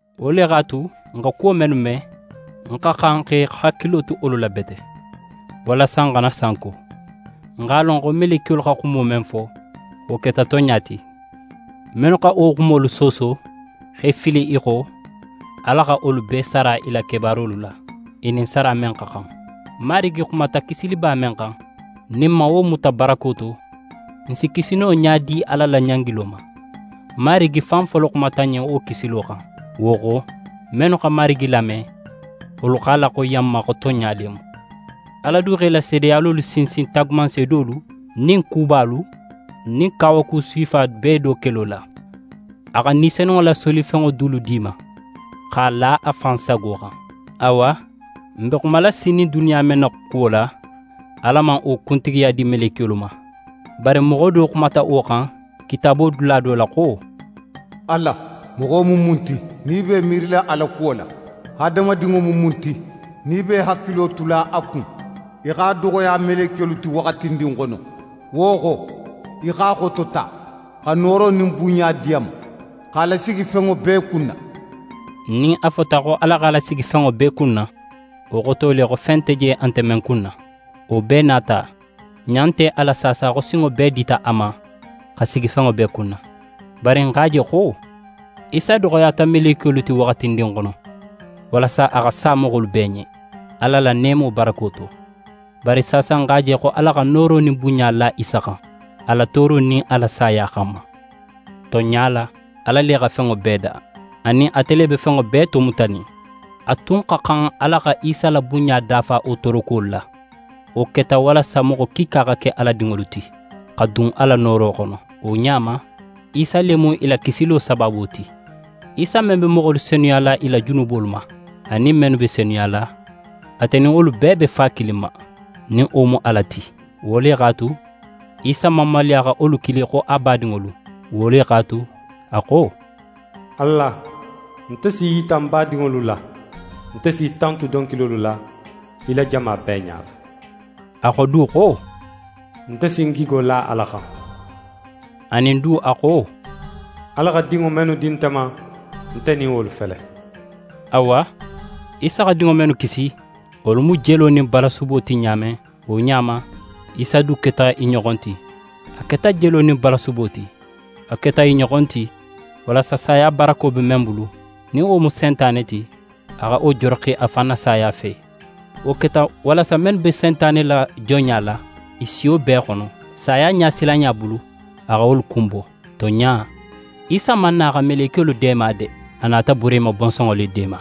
Wo le x'a tu, n xa kuwo mennu me, n xa xan xa i hakilo tu wolu la bete, walasa n xana sanko. N x'a lon xo melekiyolu xa xumo men fo, wo keta tonɲa ti. Mennu xa wo xumolu sooso, x'e fili i xo, Ala xa wolu bee sara i la kebaarolu la, i nin sara men xa xan. Marigi xumata kisiliba men xan, nin n man wo muta barako to, n si kisi no ɲa di Ala la ɲangilo ma? Marigi fan folo xumata n ɲen wo kisilo xan. Wo xo, mennu xa Marigi lame, wolu x'a laxoyiya n ma xo tonɲa le mu. Ala du xa i la seedeyalolu sinsin taagumanseedolu nin kubalu nin kawaku sifa bee do kelo la. A xa Ni Senunŋo la solifenŋo dulu di i ma, x'a la a fan sago xan. Awa, n be xumala sinin duniya men na kuwo la, Ala man wo kuntigiya di melekiyolu ma. Bari moxo do xumata wo xan Kitaabo dula do la xo: «Ala, moxo mu mun ti, nin í be í miirila a la kuwo la? Hadamadinŋo mu mun ti, nin í be í hakilo tula a kun? Í x'a doxoya melekiyolu ti waxatindin xono, wo xo, í x'a xotota xa nooro nin bunɲa di a ma, x'a lasigi fenŋo bee kunna.» Nin a fota xo Ala x'a lasigi fenŋo bee kunna, wo xoto le, xo fen nte je, a nte men kunna. Wo bee nin a ta, n ɲa nte a la saasa xo sinŋo bee dita a ma xa sigi fenŋo bee kunna. Bari n x'a je xo: Isa doxoyata melekiyolu ti waxatindin xono, walasa a xa sa moxolu bee ɲen, Ala la neemo barako to. Bari saasa n x'a je xo Ala xa nooro nin bunɲa la Isa xan, a la tooro nin a la saya xanma. Tonɲa la, Ala le xa fenŋo bee da, anin ate le be fenŋo bee tomutanin. A tun xa xan Ala xa Isa la bunɲa dafa wo toorokuwolu la. Wo keta walasa moxo kiika xa ke Ala dinŋolu ti, xa dun a la nooro xono. Wo ɲa ma, Isa le mu i la kisilo sabaabo ti. Isa men be moxolu senuyala i la junubolu ma, anin mennu be senuyala, ate nin wolu bee be Fa kilin ma, nin wo mu Ala ti. Wo le x'a tu, Isa man maluya xa wolu kili xo a badinŋolu. Wo le x'a tu, a xo: «Ala, nte si í yita ń badinŋolu la, nte s'í tantu donkilolu la, í la jama bee ɲala.» A xo du xo: «Nte si ń gigo la Ala xan.» Anin du a xo: «Ala xa dinŋo mennu di nte ma, nte nin wolu fele.» Awa, Isa xa dinŋo mennu kisi, wolu mu jelo nin balasubo ti ɲa men, wo ɲa ma, Isa du keta i ɲoxon ti, a keta jelo nin balasubo ti. A keta i ɲoxon ti, walasa saya barako be men bulu, nin wo mu Sentane ti, a xa wo joroxi a fan na saya fe. Wo keta walasa mennu be Sentane la jonɲa la, i siyo bee xono, saya ɲasilanɲa bulu, a xa wolu kunbo. Tonɲa, Isa man na xa melekiyolu deema de; a nata Burehima bonsonŋo le deema.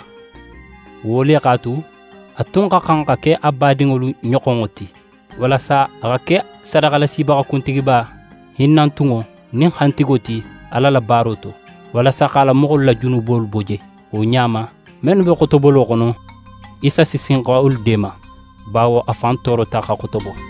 Wo le x'a tu, a tun xa xan xa ke a badinŋolu ɲoxonŋo ti, walasa a xa ke sadaxalasibaxa kuntigiba hinnantunŋo nin xantigo ti Ala la baaro to; walasa x'a la moxolu la junubolu bo je. Wo ɲa ma, mennu be xotobolo xono, Isa si sin xa wolu deema, bawo a fan toorota xa xotobo.